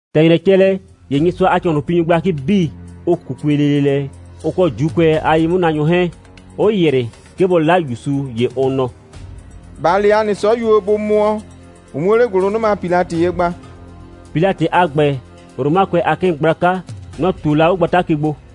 ‑Tɛ ‑nyrɛ cɛ lɛ, ‑ye Nyɩsʋa a ‑cɔhlʋnpinyʋ gblakɩ 'bii, ʋ 'kukue lele lɛ, ʋ kɔ ‑Juukʋɛ a ye'mʋnaanyʋ 'hɛɛn, 'ʋ ‑yrɩ, 'ke bʋ 'la ‑Yusu. ‑Ye ʋ nɔ: «‑Ba le ‑a nɩ 'sɔyuo, bʋ mʋɔ, ʋ 'muo 'le ‑gʋlʋnʋma Pilatɩ ye gba.» (Pilatɩ a ‑gbɛ, Romakʋɛ a 'kɩɩn gblaka, nɔ‑ ꞊tuo la 'o gbata ke gbo.)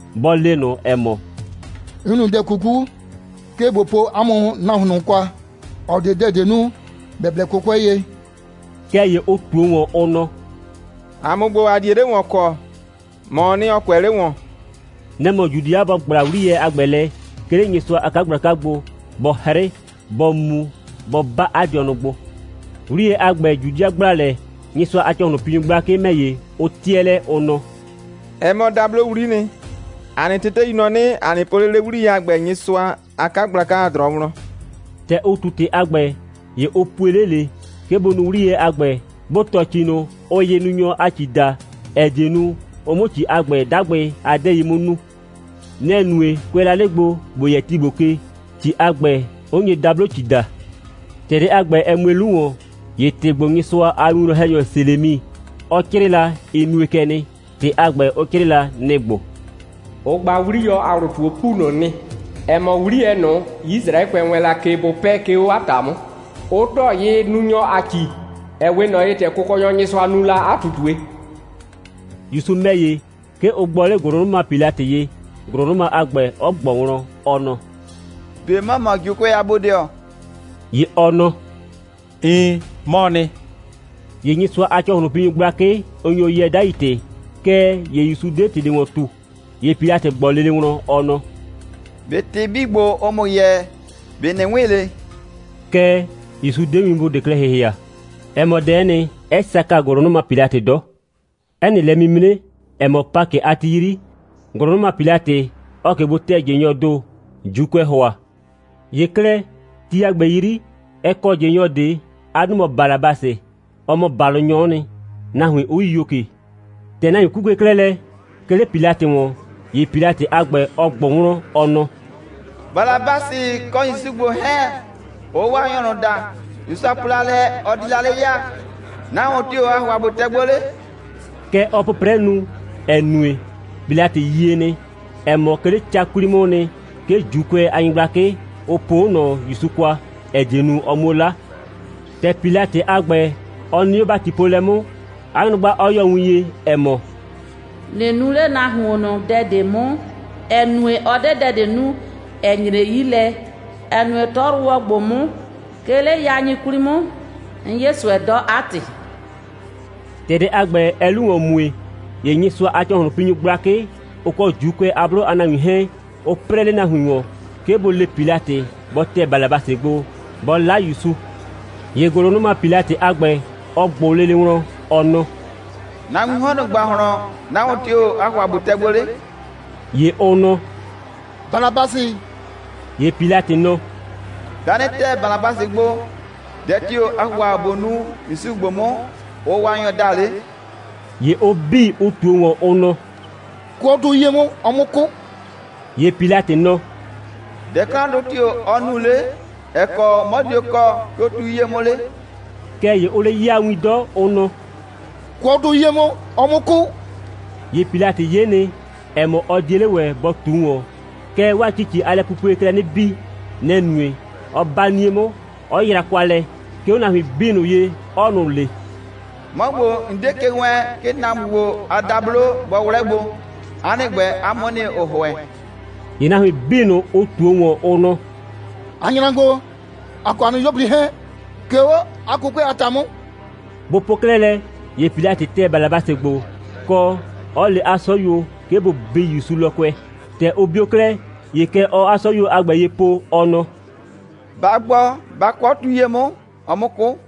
bɔ le ꞊nʋ, ‑ɛ mɔ: «'N nu dɛ 'kuku, 'ke ꞊bo po 'a mʋ nahuon ꞊nʋ kwa, ‑ɔ 'de dɛ ꞊de nu, ‑bɛ blɛ 'kʋkʋɛ ye.» Kɛɛ ‑ye ʋ ꞊tuo ‑wɔn, ʋ nɔ: «‑A mʋ ‑gbo, ‑a 'die 'le ‑wɔn kɔ. ‑Mɔɔ nɩ, ‑ɔ kʋɛ 'le ‑wɔn.» Nɛ‑ mɔ Judɩa bɔ ‑gbla 'wliyɛ a ‑gbɛ lɛ, 'ke 'le Nyɩsʋa a 'kagblaka gbo, bɔ 'hrɩ, bɔ mu, bɔ 'ba 'a dɩɔnʋ gbo. 'Wliyɛ a ‑gbɛ, Judɩa ‑gbla lɛ, Nyɩsʋa a ‑cɔhlʋnpinyʋ gblakɩ ‑mɛ ‑ye, ʋ 'tɩɛ lɛ, ʋ nɔ: «Ɛ mɔ dablowli'i nɩ. ‑A nɩ tetei nɔ 'nɩ, ‑a nɩ po 'le 'le 'wliyɛ a ‑gbɛ Nyɩsʋa a 'kagblaka a ‑drɔɔ wlɔn.» ‑Tɛ ʋ ꞊tu ‑tɩ a ‑gbɛ, ‑ye ʋ pue 'le ꞊le, 'ke bʋ nu 'wliyɛ a ‑gbɛ, bʋ ‑tɔ ‑ci ꞊nʋ, ʋʋ yɩnunyɔ a ‑ci daa, ‑ɛ die nu, ʋ 'mʋ ‑ci a ‑gbɛ 'dagbɩ a 'dɛɛi 'mʋ nuu. Nɛ‑ nue, kʋɛ la 'le gbo, ‑bo yɛ ti ‑gbo ke, ‑ci a ‑gbɛ, 'ʋ nye dablo‑ci daa. ‑Tɛ dɛ a ‑gbɛ, ɛ mue 'lu ‑wɔn, ‑ye ‑tɩ ‑gbo, Nyɩsʋa a winwlɔn‑hɛnyɔ Selemi, ɔ 'crɩɩ la, ɩ nue kɛ nɩ. ‑Tɩ a ‑gbɛ, ɔ 'crɩɩ la, nɩ‑ ‑gbo: «Ʋ gba 'wliyɔ a ‑wlʋ ꞊tu 'o ‑pu ꞊nʋ nɩ, ‑ɛ mɔ 'wliyɛ ꞊nʋ, Yisraɛkʋɛ wɛɛn la ke, bʋ 'pɛɛ, 'ke 'o 'a ‑ta 'mʋ, 'ʋ ‑tɔ yɩnunyɔ a ‑ci, ‑ɛ 'we ꞊nɔ ye, ‑tɛ Kʋkɔnyɔ Nyɩsʋa nu la 'a ꞊tutue.» ‑Yusu ‑mɛ ‑ye, 'ke ʋ gbɔ 'le ‑gʋlʋnʋma Pilatɩ ye, ‑gʋlʋnʋma a ‑gbɛ 'ɔ ꞊gbɔ wlɔn, ɔ nɔ: «꞊Be ‑mɔ mɔ ‑Juukʋɛ a bodɩɔ?» ‑Ye ɔ nɔ: «Iin, 'mɔɔ nɩ.» ‑Ye Nyɩsʋa a ‑cɔhlʋnpinyʋ gblakɩ, ʋ nyo yɛɛ 'dai ‑tɩ, kɛɛ, ‑Yusu 'de ‑tɩ ꞊de ‑wɔn ꞊tu. ‑Ye Pilatɩ ꞊gbɔ lele wlɔn, ɔ nɔ: «꞊Be ‑tɩ 'bii ‑gbo, ʋʋ ‑mʋ yɛɛ, ꞊be ꞊nɩ 'wɩn ꞊le?» Kɛɛ, ‑Yusu 'de winbʋ ꞊de klɛ ‑hɩhɩa. Ɛ mɔ dɛ'ɛ nɩ, 'ɛ saka ‑gʋlʋnʋma Pilatɩ 'dɔ. 'Ɛ nɩ lɛ'mimre, ‑ɛ mɔ Pakɩ a ti 'yri, ‑gʋlʋnʋma Pilatɩ, ɔɔ ꞊ke gbo tɛ ꞊jɩnyɔɔ ‑do, ‑Juukʋɛɛ ‑hʋa. ‑Ye 'klɛɛ, ti a ‑gbɛ 'yri, ɛ kɔ ꞊jɩnyɔ ꞊de. 'A 'dʋ mɔ Balabasɩ. Ɔ mɔ ‑balʋnyɔ'ɔ nɩ, nahuin 'ʋ yio ꞊ke. ‑Tɛ nahuin 'kukue 'klɛɛ lɛ, 'ke 'le Pilatɩ ‑wɔn, ‑ye Pilatɩ a ‑gbɛ, ɔ ꞊gbʋ wlɔn, ɔ nɔ: «Balabasɩ, kɔ ‑Yusu ‑gbo 'hɛɛn, ʋʋ Waanyɔ ꞊nʋ daa, Nyɩsʋa po la lɛ, ɔ di la 'le ya, nahuon tio‑ aa ‑hʋa ꞊bo tɛ gbo 'le?» Kɛ ɔɔ 'pʋprɛ nu, ‑ɛ nue, Pilatɩ yie nɩ, ‑ɛ mɔ, 'ke 'le ca 'kwli 'mʋʋ nɩ, 'ke ‑Juukʋɛ a nyɩgblakɩ, ʋ poo 'o ꞊nɔ ‑Yusu kwa, ‑ɛ die nu, ɔ 'muo 'la. ‑Tɛ Pilatɩ a ‑gbɛ, ɔ nɩ 'o ‑batipoolɛ 'mʋ, 'a nyrʋgba 'ɔ yɔ win ye, ‑ɛ mɔ: «꞊Nɩ nu 'le nahuon ꞊nʋ dɛ ꞊de 'mʋ, ‑ɛ nue, ɔ 'de dɛ ꞊de nu, ‑ɛ nyre 'yi lɛ, ‑ɛ nue, 'tɔyrʋwɔ ‑gbo 'mʋ, 'ke 'le yain 'kwli 'mʋ, 'n 'ye ꞊sʋɛ 'dɔ, 'a ‑tɩ.» ‑Tɛ dɛ a ‑gbɛ, ɛɛ 'lu ‑wɔn mue, ‑ye Nyɩsʋa a ‑cɔhlʋnpinyʋ gblakɩ, ʋ kɔ ‑Juukʋɛ a 'blʋ a nahuin 'hɛɛn, ʋ 'prɛɛ 'le nahuin ‑wɔn, 'ke bʋ le Pilatɩ, bɔ tɛ Balabasɩ gbo, bɔ 'la ‑Yusu. ‑Ye ‑gʋlʋnʋma Pilatɩ a ‑gbɛ, ɔ ꞊gbʋ lele wlɔn, ɔ nɔ: «Nahuiin 'hɔn ꞊nʋ ‑gbahlɔn, nahuon tio‑ aa ‑hʋa ꞊bo tɛ gbo 'le?» ‑Ye ʋ nɔ: «Balabasɩ!» ‑Ye Pilatɩ nɔ: «'Bɩa 'nɩ tɛ Balabasɩ gbo, dɛ tio‑ aa ‑hʋa ꞊bo nu ‑Yusu ‑gbo 'mʋ, ʋʋ Waanyɔ daa 'le?» ‑Ye ʋ 'bii, ʋ ꞊tuo ‑wɔn, ʋ nɔ: «Kʋɔ 'o tu 'yie 'mʋ, ɔ 'mʋ 'kʋ!» ‑Ye Pilatɩ nɔ: «Dɛ 'klandʋ tio‑ ɔ nu 'le, ‑ɛ kɔ 'mɔ dio kɔɔ, 'ke 'o tu 'yie 'mʋ 'le?» Kɛɛ ‑ye ʋʋ 'le 'yaa win 'dɔ, ʋ nɔ: «Kʋɔ 'o tu 'yie 'mʋ, ɔ 'mʋ 'kʋ!» ‑Ye Pilatɩ 'ye nɩ, ‑ɛ mɔ, ɔ 'die 'le ‑wɛ bɔ ꞊tu ‑wɔn, kɛɛ, 'waa ‑cici a lɛpupuee klɛ 'nɩ bii. Nɛ‑ nue, 'ɔ 'ba 'nie 'mʋ, 'ɔ yra kwa lɛ, 'ke 'o nahuin 'bii ꞊nʋ ye, 'ɔɔ ꞊nʋ le: «'Mɔ ‑gbo, 'n 'die ke wɛɛn, 'ke nahuon ‑gbo a dablo bɔ 'wlɛ gbo. 'A nɩ ‑gbɛ, 'a mʋ'ʋ nɩ, ‑ʋ ‑hʋɛ.» ‑Ye nahuin 'bii ꞊nʋ, ʋ ꞊tuo ‑wɔn, ʋ nɔ: «‑A nyra gbo, ‑a kɔ ‑a nɩ 'yuo꞊pli 'hɛɛn, 'ke 'o 'a 'kʋkʋɛ a ‑ta 'mʋ.» Bʋ po 'klɛɛ lɛ, ‑ye Pilatɩ tɛ Balabasɩ gbo, kɔ, 'ɔ le 'a 'sɔyuo, 'ke bʋ bii ‑Yusu lɔkʋɛ. ‑Tɛ ʋ bio 'klɛɛ, ‑ye kɛ ɔɔ 'a 'sɔyuo a ‑gbɛ ye po, ɔ nɔ: «Ba gbɔ, ba kʋɔ 'o tu 'yie 'mʋ, ɔ 'mʋ 'kʋ!»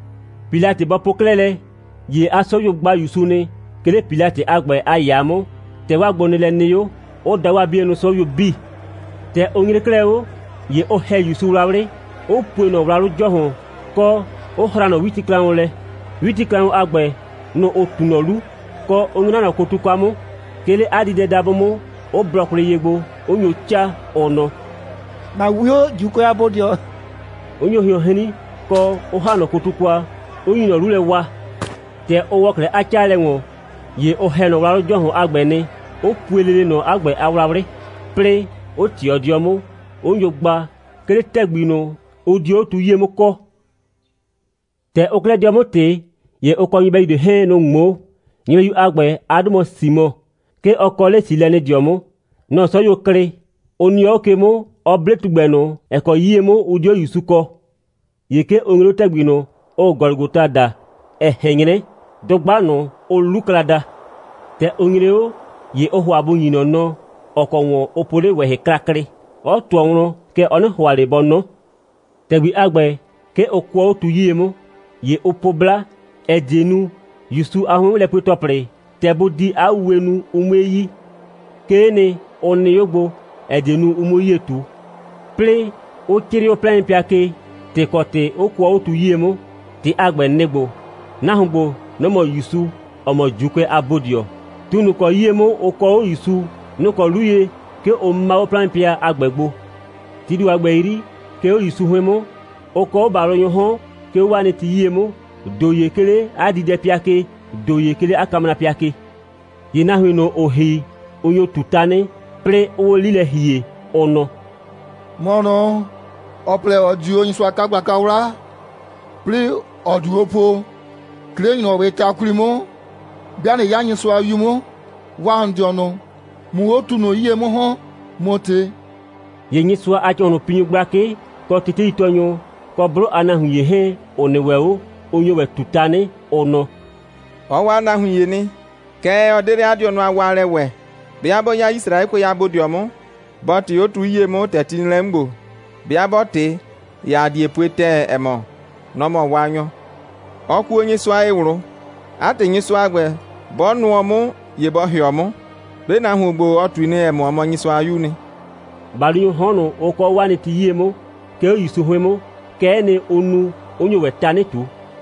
Pilatɩ bɔ po 'klɛɛ lɛ, ‑ye 'a 'sɔyuo gba ‑Yusu nɩ, 'ke 'le Pilatɩ a ‑gbɛ a ‑yaa 'mʋ, ‑tɛ 'waa gbonɩɩlɛ nɩ 'o, 'ʋ da 'waa 'bienʋ 'sɔyuo 'bii. ‑Tɛ ʋ nyre 'klɛɛ 'o, ‑ye ʋ ‑hɛ ‑Yusu wlawlɩ, 'ʋ pue ꞊nɔ wlawlʋ ‑jɔhʋn, kɔ, 'ʋ hraa ꞊nɔ 'witiklaʋn lɛ. 'Witiklaʋn a ‑gbɛ, nʋ‑ ʋ ꞊tu ꞊nɔ 'lu, kɔ, 'ʋ 'nyra ꞊nɔ kotu kwa 'mʋ, 'ke 'le 'a diidɛdabʋ 'mʋ, 'ʋ blɔ kwlɩ ye gbo, 'ʋ nyo 'caa, ʋ nɔ: «‑Na 'wio, ‑Juukʋɛ a bodɩɔ,» 'ʋ nyo hɩɔn 'hrin, kɔ, 'ʋ ‑ha ꞊nɔ kotu kwa, 'ʋ nyu ꞊nɔ 'lu lɛ waa. ‑Tɛ ʋ ‑wɔ 'klɛɛ 'a 'caalɛ ‑wɔn, ‑ye ʋ ‑hɛ ꞊nɔ wlawlʋ ‑jɔhʋn a ‑gbɛ nɩ, 'ʋ pue lele ꞊nɔ 'a ‑gbɛ a wlawlɩ, 'plɩɩ 'ʋ ꞊tɩɔ 'dɩɔ 'mʋ, 'ʋ nyo gba, 'ke 'le ‑tɛgbi ꞊nʋ, ʋ dio 'o tu 'yie 'mʋ kɔɔ. ‑Tɛ ʋʋ 'klɛɛ 'dɩɔ 'mʋ ꞊tɩ, ‑ye ʋ kɔ nyɩbɛyu ꞊de 'hɛɛn, nʋ‑ ꞊ŋmoo. Nyɩbɛyu a ‑gbɛ, 'a 'dʋ mɔ Simɔ. 'Ke ɔ kɔ 'le Silɛnɩdɩɔ 'mʋ. Nɔ‑ 'sɔyuo klɩ, 'ʋ nɩɔ 'o ke 'mʋ, 'ɔ 'ble tugbɛ ꞊nʋ, ‑ɛ kɔ 'yie 'mʋ ʋ di 'o ‑Yusu kɔɔ. ‑Ye 'ke ʋ nyre 'o ‑tɛgbi ꞊nʋ, ʋʋ Gɔlʋgɔta daa, ‑ɛ ꞊hɛn 'nyrɛ dʋgba ꞊nʋ, ʋʋ 'Lukla daa. ‑Tɛ ʋ nyre 'o, ‑ye ʋʋ ‑hʋa bʋ ‑nyi ꞊nɔ nɔ, ‑ɔ kɔ ‑wɔn ʋ po 'le ꞊wɛhɩ klaklɩ, 'ɔ ꞊tʋɔ wlɔn, kɛɛ, ɔ 'nɩ ‑hʋa ꞊le bɔ 'nɔ. ‑Tɛgbi a ‑gbɛ, 'ke ʋ kʋɔ 'o tu 'yie 'mʋ. ‑Ye ʋ po 'bla, ‑ɛ die nu, ‑Yusu a 'hʋɩn'mʋlɛpue‑tɔplɩ, ‑tɛ bʋ di 'a wuwe nu, ʋ 'mue yi. 'Kee nɩ, ʋ nɩ 'o gbo, ‑ɛ die nu, ʋ 'muo 'yie ꞊tu. 'Plɩɩ 'ʋ 'crɩɩ 'o 'plaɩnpɩa ke, ‑tɩ ‑kɔ ‑tɩ 'ʋ kʋɔ 'o tu 'yie 'mʋ. ‑Tɩ a ‑gbɛ, nɩ‑ ‑gbo: «Nahuon ‑gbo, nɔ‑ mɔ ‑Yusu, ‑ɔ mɔ ‑Juukʋɛ a bodɩɔ.» Tu ꞊nʋ, ‑ʋ kɔ 'yie 'mʋ ʋ kɔɔ 'o ‑Yusu, nʋ‑ kɔ 'lu ye, 'ke ʋ 'maa 'o 'plaɩnpɩa a ‑gbɛ gbo. Tii ‑do a ‑gbɛ 'yri, 'ke 'o ‑Yusu 'hʋɩn 'mʋ, ʋ kɔɔ 'o ‑balʋnyʋʋ 'hɔn, 'ke 'o 'waa nɩ ti 'yie 'mʋ, ‑do ‑ye 'ke 'le 'a diidɛpɩa ke, ‑do ‑ye 'ke 'le 'a kamrapɩa ke. ‑Ye nahuin ꞊nʋ, ‑ʋʋ ‑hi, ʋ nyo ꞊tu tanɩ, 'plɩɩ 'ʋʋ 'o 'li lɛ ‑hie, ʋ nɔ: «‑Mɔ ꞊nʋ, ‑ɔ plɛ, ‑ɔ di o Nyɩsʋa a 'kagblaka 'wla, 'plɩɩ ‑ɔ diu o po, 'ke 'le ‑nyrɔwɩɩ ta 'kwli 'mʋ, 'bɩa ꞊nɩ 'ya Nyɩsʋa a 'Yu 'mʋ, waa ‑n dɩɔnʋ, ꞊mʋ 'o tu ꞊nʋ 'yie 'mʋ ‑hɔn, ꞊mʋ ꞊tɩ.» ‑Ye Nyɩsʋa a ‑cɔhlʋnpinyʋ gblakɩ, kɔ teteitɔɔnyʋ, kɔ 'blʋ a nahuin ‑ye 'hɛɛn, ‑ʋ nɩ ‑wɛ 'o, ʋ nyo ‑wɛ ꞊tu tanɩ, ʋ nɔ: «Ɔ waa nahuin ‑ye nɩ, kɛɛ, ɔ 'de 'le 'a dɩɔnʋ a waalɛ ‑wɛ. 'Bɩa 'bɔ 'ya Yisraɛkʋɛ a bodɩɔ 'mʋ, bɔ ꞊tɩ 'o tu 'yie 'mʋ, ‑tɛ ti nɩ lɛ 'mʋ ‑gbo. 'Bɩa 'bɔ ꞊tɩ, ‑ye ‑a die pue ‑tɛɛ, ‑ɛ mɔ, nɔ‑ mɔ Waanyɔ. Ɔ kuo Nyɩsʋa ye ꞊wlʋ. 'A ‑tɩ, Nyɩsʋa a ‑gbɛ, 'bɔ nʋɔ 'mʋ, ‑ye bɔ ‑hɩɔ 'mʋ. 'Be nahuon ‑gbo, ɔ ꞊tui nɩ, ‑ɛ mɔ, ɔ mɔ Nyɩsʋa a 'Yuu nɩ.» ‑Balʋnyʋʋ 'hɔn ꞊nʋ, ʋ kɔɔ 'o 'waa nɩ ti 'yie 'mʋ, 'ke 'o ‑Yusu 'hʋɩn 'mʋ, kɛ'ɛ nɩ, ʋ nu, 'ʋ nyo ‑wɛ tanɩ ꞊tu.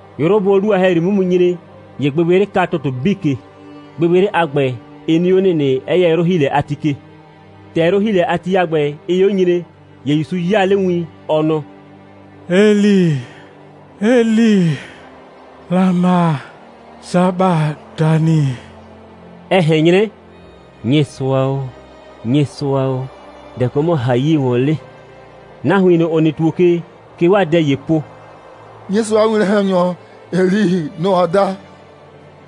'Yrʋ bʋʋ 'o 'lu a ‑hɛyri 'mʋ mu nyre, ‑ye gbɩgbɩyrɩ ka ‑tʋtʋ 'bii ke. Gbɩgbɩyrɩ a ‑gbɛ, ɩ nɩ 'o ‑nɩnɩ, 'ɛ yɛ 'yrʋ‑hiilɛ a ti ke. ‑Tɛ 'yrʋ‑hiilɛ a ti a ‑gbɛ, ɩɩ 'o nyre, ‑ye ‑Yusu 'yaa 'le win, ɔ nɔ: «Eli, Eli, lama sabatani?» ‑ɛ ꞊hɛn 'nyrɛ: «Nyɩsʋa o, Nyɩsʋa o, dɛ‑ kɔ 'mɔ ‑n ‑ha 'yie ‑wɔn 'le?» Nahuin ꞊nʋ, ‑ʋ nɩ ‑tuo ke, kɛ 'waa dɛ ‑yee po: «Nyɩsʋa a winwlɔn‑hɛnyɔ Eli, nɔ‑ ɔɔ da.»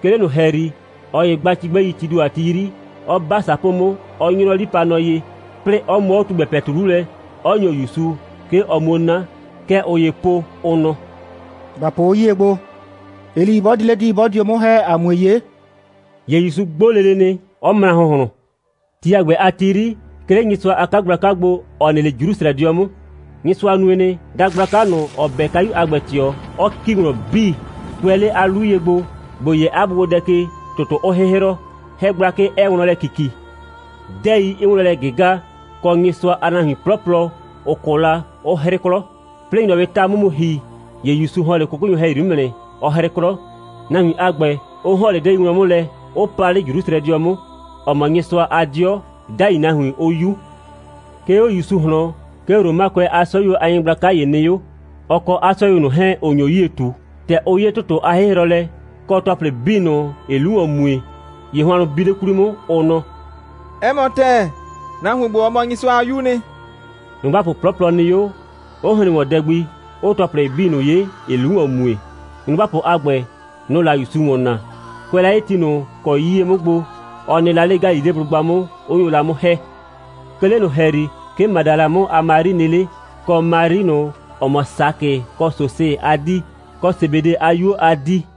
'Ke 'le ꞊nʋ ‑hɛyri, ꞊ɔ ‑ye gba cigbɛi, tii ‑do a ti 'yri, 'ɔ 'ba ‑sapoo 'mʋ, 'ɔ 'nyrɔ 'lipanɔ ye, 'plɩɩ 'ɔ mʋɔ 'o tugbɛ ‑pɛtu 'lu lɛ, 'ɔ ‑nyo ‑Yusu, 'ke ɔ 'muo 'na. Kɛ ꞊ʋ ‑yee po, ʋ nɔ: «‑Ba po 'o 'yie gbo, Eli 'bɔ di 'le di, 'bɔ dio 'mʋ ‑hɛ, ‑a 'mue 'ye.» ‑Ye ‑Yusu 'gbo lele nɩ, 'ɔ mra ‑hʋnhlʋn. Ti a ‑gbɛ a ti 'yri, 'ke 'le Nyɩsʋa a 'kagblaka gbo, ‑ɔ nɩ 'le Jrusrɛdɩɔ 'mʋ, Nyɩsʋa nue nɩ, dagblaka ꞊nʋ, ‑ʋ 'bɛ kayu a ‑gbɛ ꞊tɩɔ, 'ʋ ‑ki wlɔn 'bii, kʋɛ 'le 'a 'lu ye gbo, ‑bo yɛ 'a bʋgbodɛ ke, ‑tʋtʋ 'ʋʋ 'hɩhrɔ, 'hɛ gblakɩ 'ɛɛ wlɔn lɛ ‑kiki, 'dɛɛi 'ɩɩ wlɔn lɛ ꞊gɩga, kɔ, Nyɩsʋa a nahuin 'plɔplɔ, ‑ʋ 'kʋ la, 'ʋ 'hrɩ 'klɔ, 'plɩɩ ‑nyrɔwɩɩ ta 'mʋ mu ‑hi, ‑ye ‑Yusu ‑hɔn 'le 'kʋkʋnyʋ ‑hɛyri 'mʋ nɩ, 'ɔ 'hrɩ 'klɔ, nahuin a ‑gbɛ, 'ʋ ‑hɔn 'le 'dɛɛi wlɔn 'mʋ lɛ, 'ʋ pa 'le Jrusrɛdɩɔ 'mʋ, ‑ɔ mɔ Nyɩsʋa a 'dɩɔ, 'dai nahuin 'ʋ 'yu. 'Ke 'o ‑Yusu ꞊hlɔn, 'ke Romakʋɛ a 'sɔyuo a nyɩgblaka ‑ye nɩ 'o, ɔ kɔ 'a 'sɔyuo ꞊nʋ 'hɛɛn, ‑ʋ nyo 'yie ꞊tu. ‑Tɛ ʋ 'ye ‑tʋtʋ a 'hɩhrɔlɛ, kɔ ‑tɔplɩ 'bii ꞊nʋ, ‑ɩɩ 'lu ‑wɔn mue, ‑ye hʋannʋ biu 'le 'kwli 'mʋ, ʋ nɔ: «'Ɛ mɔ ‑tɛɛ, nahuon ‑gbo, ɔ mɔ la Nyɩsʋa a 'Yuu nɩ.» Nyrʋgbapʋ 'plɔplɔ nɩ 'o, 'ʋ hren ‑wɔn dɛ gbi, 'ʋʋ ‑tɔplɩ 'bii ꞊nʋ 'ye, ‑ɩɩ 'lu ‑wɔn mue. Nyrʋgbapʋ a ‑gbɛ, nʋ‑ʋ la ‑Yusu ‑wɔn naa, kʋɛ la 'le ti ꞊nʋ ‑kɔ 'yie 'mʋ gbo, ɔ nɩ la 'le Galileblʋgba 'mʋ, 'ʋ nyo la 'mʋ ‑hɛ. 'Ke 'le ꞊nʋ ‑hɛyri, 'ke Madala 'mʋ a Mari nɩ 'le, kɔ Mari ꞊nʋ, ‑ɔ mɔ Sakɩ kɔ Sosɩ a 'dii, kɔ Sebede a 'yuo a 'dii.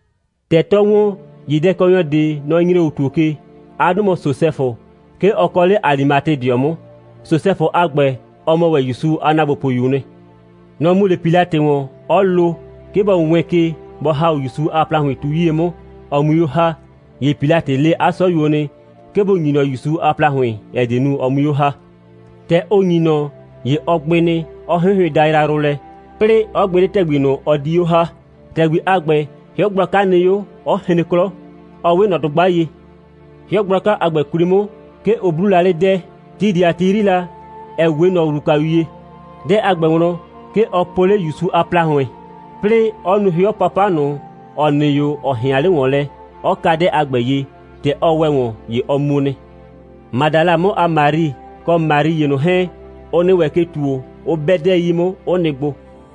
‑Tɛ 'tɔɔ ‑wɔn, ‑ye dɛkɔnyɔ ꞊de, nɔ‑ nyre 'o ‑tuo ke. 'A 'dʋ mɔ Sosɛfʋ. 'Ke ɔ kɔ 'le Alimatedɩɔ 'mʋ. Sosɛfʋ a ‑gbɛ, ɔ mɔ ‑wɛ ‑Yusu a ‑naagbopʋyuu nɩ. Nɔ‑ mu 'le Pilatɩ ‑wɔn, 'ɔ lo, 'ke bɔ wɛɛn ke, bɔ ‑ha 'o ‑Yusu a ‑plahʋɩn tu 'yie 'mʋ, ɔ 'mui 'o ‑ha. ‑Ye Pilatɩ le 'a 'sɔyuo nɩ, 'ke bʋ ‑nyi ꞊nɔ ‑Yusu a ‑plahʋɩn, ‑ɛ die nu, ɔ 'mui 'o ‑ha. ‑Tɛ ʋ ‑nyi ꞊nɔ, ‑ye ɔ gbɩ nɩ, 'ɔ 'hɩnhɩʋɩn dayrayrʋ lɛ, 'plɩɩ 'ɔ gbɩ 'le ‑tɛgbi ꞊nʋ, ɔ di 'o ‑ha. ‑Tɛgbi a ‑gbɛ, 'hɩɔ gblaka nɩ 'o, 'ɔ hren 'klɔ, 'ɔ 'we ꞊nɔ dʋgba ye. 'Hɩɔ gblaka a ‑gbɛ 'kwli 'mʋ, 'ke ʋ 'bluu la 'le 'dɛɛ, (ti ꞊de a ti 'yri la, ‑ɛ 'we ꞊nɔ ‑wlukayu ye). 'Dɛɛ a ‑gbɛ wlɔn, 'ke ɔ po 'le ‑Yusu a ‑plahʋɩn, 'plɩɩ 'ɔ nu 'hɩɔ 'papa ꞊nʋ, ‑ɔ nɩ 'o, ‑ɔ ꞊hɩan 'le ‑wɔn lɛ, 'ɔ ka 'dɛɛ a ‑gbɛ ye. ‑Tɛ ɔ ‑wɛ ‑wɔn, ‑ye ɔ mu nɩ. Madala 'mʋ a Mari, kɔ Mari ‑ye ꞊nʋ 'hɛɛn, ʋ nɩ ‑wɛ ke ‑tuo, 'ʋ 'bɛ 'dɛɛ 'yi 'mʋ, 'ʋ nɩ gbo.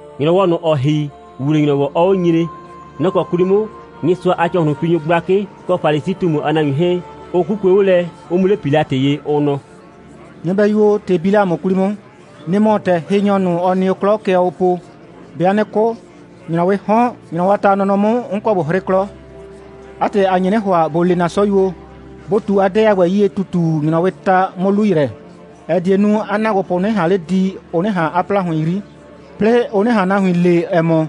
‑Nyrɔwɔ ꞊nʋ, ‑ɔ ‑hi, ‑wuwle‑nyrɔwɔ 'ɔɔ 'o nyre, nɔ‑ kɔ 'kwli 'mʋ, Nyɩsʋa a ‑cɔhlʋnpinyʋ gblakɩ kɔ Falisi꞊tumu a nahuin 'hɛɛn, ʋ 'kukue 'o lɛ, 'ʋ mu 'le Pilatɩ ye, ʋ nɔ: «Nyɩbɛyu o, ‑tɩ bi 'le ‑a mʋ 'kwli 'mʋ. Nɩ‑ mɔ, ‑tɛ hɩnyɔ ꞊nʋ, ɔ nɩ o 'klɔ, kɛ ɔɔ o po: 'Bɩa 'nɩ 'kʋ, ‑nyrɔwɩɩ 'hɔn, ‑nyrɔwɔ a ta a nɔnɔ 'mʋ, 'n kɔ ꞊bo 'hrɩ 'klɔ. 'A ‑tɩ, ‑a nye 'nɩ ‑hʋa, ‑bo le ‑na 'sɔyuo, bʋ ꞊tu 'a 'dɛɛ a ‑gbɛ 'yie ‑tutu, ‑nyrɔwɩɩ ta 'mʋ 'lu ‑yrɛ, ‑ɛ die nu, 'a ‑naagbopʋ 'nɩ ꞊han 'le di, ʋ 'nɩ ꞊han 'a ‑plahʋɩn 'yri, 'plɩɩ ʋ 'nɩ ꞊han nahuin le, ‑ɛ mɔ,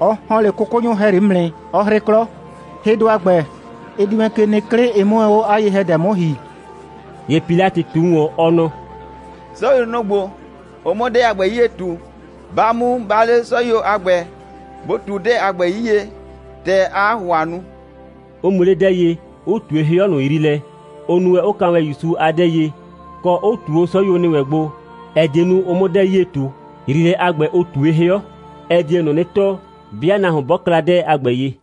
ɔ ‑hɔn 'le 'kʋkʋnyʋ ‑hɛyri 'mʋ nɩ, 'ɔ 'hrɩ 'klɔ. Hɩdʋ a ‑gbɛ, ɩ di wɛn ke nɩ 'klɩ, ɩ 'mʋ wɛn 'o 'a ye‑hɛdɛ 'mʋ ‑hi.» ‑Ye Pilatɩ ꞊tu ‑wɔn, ɔ nɔ: «'Sɔyuo, nʋ‑ ‑gbo, ʋ 'mʋ 'dɛɛ a ‑gbɛ 'yie ꞊tu. Ba mu, ba le 'sɔyuo a ‑gbɛ, bʋ ꞊tu 'dɛɛ a ‑gbɛ 'yie, ‑tɛ aa 'a ‑hʋhʋa nu,» 'ʋ mu 'le 'dɛɛ ye, 'ʋ ꞊tue 'hɩɔ ꞊nʋ yriilɛ, ʋ nu wɛn, 'ʋ ka wɛn ‑Yusu a 'dɛɛ ye, kɔ, 'ʋ ꞊tu 'o 'sɔyuo ‑nɩ wɛn gbo, ‑ɛ die nu, ʋ 'mʋ 'dɛɛ 'yie ꞊tu. (Yriilɛ a ‑gbɛ, ʋ ꞊tue 'hɩɔ, ɛ die ꞊nʋ 'nɩ tɔɔ, 'bɩa nahuon 'bɔ kla 'dɛɛ a ‑gbɛ ye.)